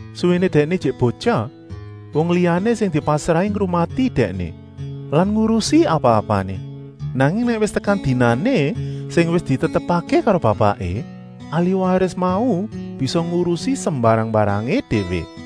Suwéné dèkné ijik botyah wong liyané sing dipasrahi ngrumati dèkné lan ngurusi apa-apané. Nanging nèk wis tekan dinané sing wis ditetepké karo bapaké, ahliwaris mau bisa ngurusi sembarang-mbarangé déwé.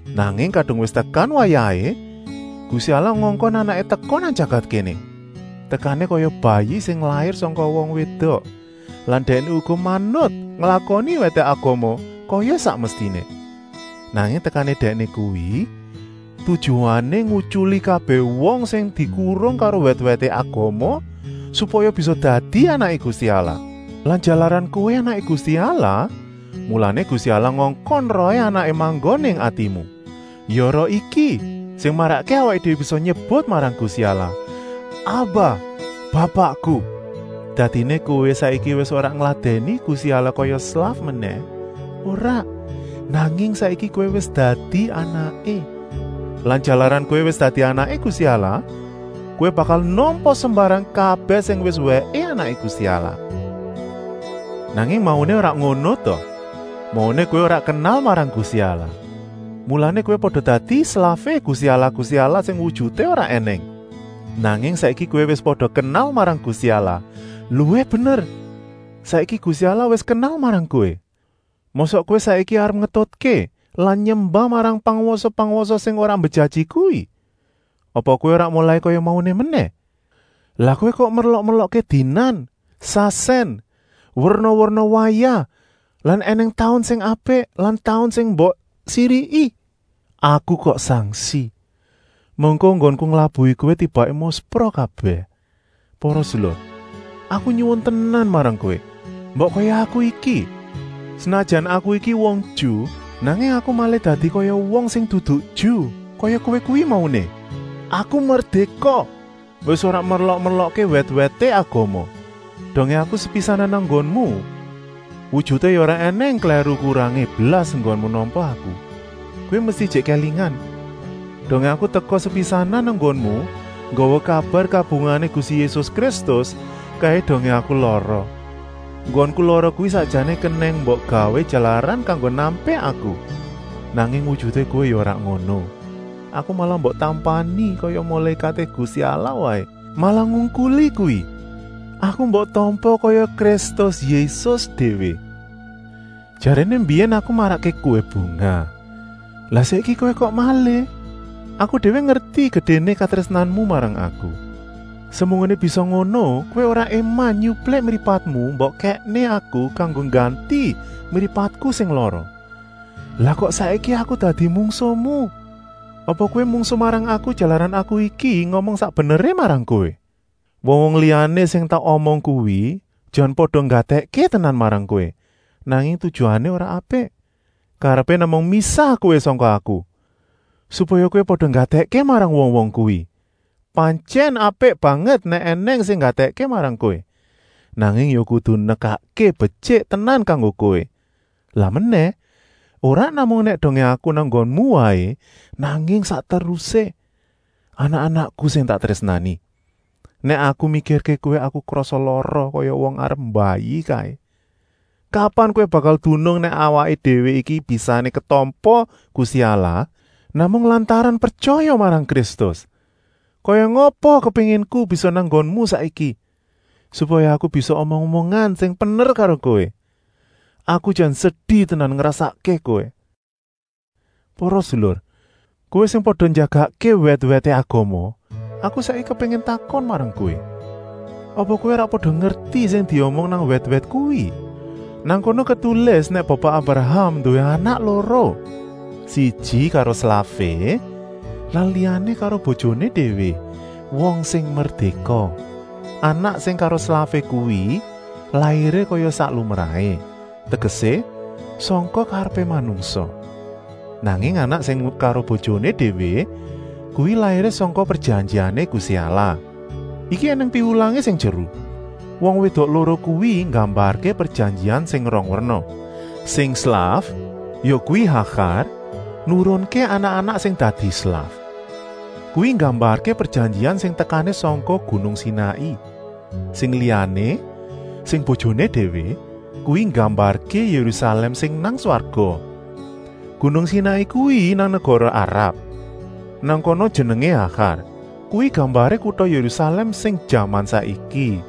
Nanging kadung wis tekan wayahé, Gusti Allah ngongkon Anaké teka nang jagat kéné. Tekané kaya bayi sing lair sangka wong wédok lan Dèkné uga manut nglakoni wèté agama kaya sak mestiné. Nanging tekané Dèkné kuwi tujuané ngutyuli kabèh wong sing dikurung karo wèt-wèté agama, supaya bisa dadi anaké Gusti Allah. Lan jalaran kowé anaké Gusti Allah, mulané Gusti Allah ngongkon Rohé Anaké manggon ing atimu. Ya Roh iki sing marakké awaké déwé bisa nyebut marang Gusti Allah: “Aba, Bapakku!” Dadiné kowé saiki wis ora ngladèni Gusti Allah kaya slaf menèh, ora, nanging saiki kowé wis dadi anaké. Lan jalaran kowé wis dadi anaké Gusti Allah, kowé bakal nampa sembarang kabèh sing wis wèké anaké Gusti Allah. Nanging mauné ora ngono ta! Mauné kowé ora kenal marang Gusti Allah, mulané kowé pada dadi slafé gusti allah-gusti allah sing wujuté ora ènèng. Nanging saiki kowé wis pada kenal marang Gusti Allah, luwih bener, saiki Gusti Allah wis kenal marang kowé. Mosok kowé saiki arep ngetutké lan nyembah marang pangwasa-pangwasa sing ora mbejaji kuwi? Apa kowé arep molai kaya mauné menèh? Lah kowé kok merlok-merlokké dinan, sasèn, werna-werna wayah lan ènèng taun sing apik lan taun sing mbok siriki. Aku kok sangsi! Mengko enggonku nglabuhi kowé tibaké muspra kabèh? Para sedulur! Aku nyuwun tenan marang kowé! Mbok kaya aku iki! Senajan aku iki wong Ju, nanging aku malih dadi kaya wong sing dudu Ju, kaya kowé kuwi mauné, aku merdéka, wis ora merlok-merlokké wèt-wèté agama. Dongé aku sepisanan nang nggonmu, wujuté ya ora ènèng klèru-kurangé blas enggonmu nampa aku. Kowé mesti ijik kélingan, dongé aku teka sepisanan nang nggonmu nggawa kabar kabungahané Gusti Yésus Kristus, kaé dongé aku lara. Enggonku lara kuwi sakjané kenèng mbok gawé jalaran kanggo nampik aku, nanging wujuté kowé ya ora ngono. Aku malah mbok tampani kaya mulékaté Gusti Allah waé, malah ngungkuli kuwi, aku mbok tampa kaya Kristus Yésus déwé. Jaréné mbiyèn aku marakké kowé bungah, lah saiki kowé kok malih. Aku déwé ngerti gedéné katrésnanmu marang aku. Semunggoné bisa ngono kowé ora éman nyuplik mripatmu mbok kèkné aku kanggo ngganti mripatku sing lara. Lah kok saiki aku dadi mungsuhmu? Apa kowé mungsuh marang aku jalaran aku iki ngomong sak beneré marang kowé? Wong-wong liyané sing tak omong kuwi jan pada nggatèkké tenan marang kowé, nanging tujuané ora apik. Karepé namung misah kowé sangka aku, supaya kowé pada nggatèkké marang wong-wong kuwi. Pantyèn apik banget nèk ènèng sing nggatèkké marang kowé, nanging ya kudu nekakké betyik tenan kanggo kowé. Lan menèh, ora namung nèk dongé aku nang nggonmu waé, nanging sak terusé. Anak-anakku sing tak trésnani! Nèk aku mikirké kowé aku krasa lara kaya wong arep mbayi kaé. Kapan kowé bakal dunung nèk awaké déwé iki bisané ketampa Gusti Allah namung lantaran pretyaya marang Kristus? Kaya ngapa kepénginku bisa nang nggonmu saiki, supaya aku bisa omong-omongan sing pener karo kowé. Aku jan sedi tenan ngrasakké kowé? Para sedulur, kowé sing pada njagakké wèt-wèté agama, aku saiki kepéngin takon marang kowé? Apa kowé ora pada ngerti sing diomong nang wèt-wèt kuwi. Nang kono ketulis nèk Bapa Abraham nduwé anak loro: siji karo slafé lan liyané karo bojoné déwé, wong sing merdéka. Anak sing karo slafé kuwi lairé kaya sak lumrahé, tegesé, sangka karepé manungsa. Nanging anak sing karo bojoné déwé kuwi lairé sangka prejanjiané Gusti Allah. Iki ènèng piwulangé sing jeru! Wong wédok loro kuwi nggambarké prejanjian sing rong werna. Sing slaf, yakuwi Hagar, nurunké anak-anak sing dadi slaf. Kuwi nggambarké prejanjian sing tekané sangka gunung Sinai. Sing liyané, sing bojoné déwé, kuwi nggambarké Yérusalèm sing nang swarga. Gunung Sinai kuwi nang negara Arab, nang kana jenengé Hagar. Kuwi gambaré kuta Yérusalèm sing jaman saiki.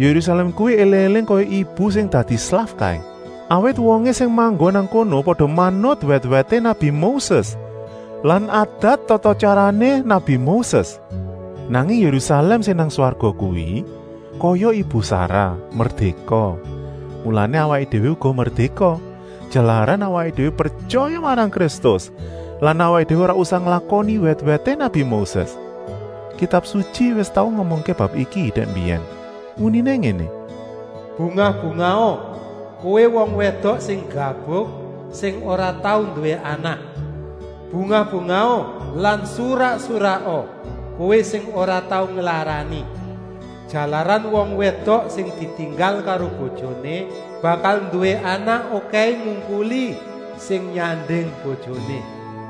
Yérusalèm kuwi éling-éling kaya ibu sing dadi slaf kaé, awit wongé sing manggon nang kono pada manut wèt-wèté nabi Moses lan adat tata-tyarané nabi Moses. Nanging Yérusalèm sing nang swarga kuwi kaya Ibu Sarah, merdéka. Mulané awaké déwé uga merdéka, jalaran awaké déwé pretyaya marang Kristus lan awaké déwé ora usah nglakoni wèt-wèté nabi Moses. Kitab Sutyi wis tau ngomongké bab iki dèk mbiyèn. Uniné ngéné: “Bungah-bungaha, kowé wong wédok sing gabuk, sing ora tau nduwé anak! Bungah-bungaha lan surak-suraka, kowé sing ora tau nglarani. Jalaran wong wédok sing ditinggal karo bojoné bakal nduwé anak okèhé ngungkuli sing nyanding bojoné.”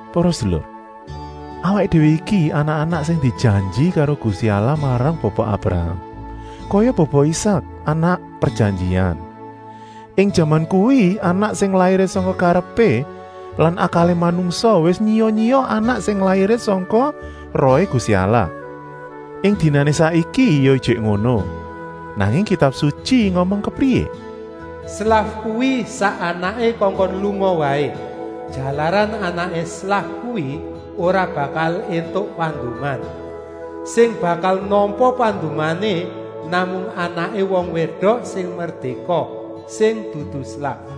Para sedulur, awaké déwé iki anak-anak sing dijanji karo Gusti Allah marang Bapa Abraham, kaya Bapa Isak, anak prejanjian. Ing jaman kuwi anak sing lairé sangka karepé lan akalé manungsa wis nyiya-nyiya anak sing lairé sangka Rohé Gusti Allah. Ing dinané saiki ya ijik ngono. Nanging Kitab Sutyi ngomong kepriyé? “Slaf kuwi sak anaké kongkon lunga waé, jalaran anaké slaf kuwi ora bakal éntuk panduman. Sing bakal nampa pandumané namung anaké wong wédok sing merdéka, sing dudu slaf.”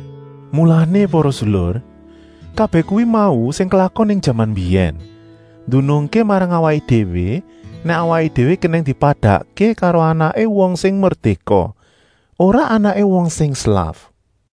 Mulané para sedulur! Kabèh kuwi mau sing klakon ing jaman mbiyèn, ndunungké marang awaké déwé nèk awaké déwé kenèng dipadakké karo anaké wong sing merdéka, ora anaké wong sing slaf.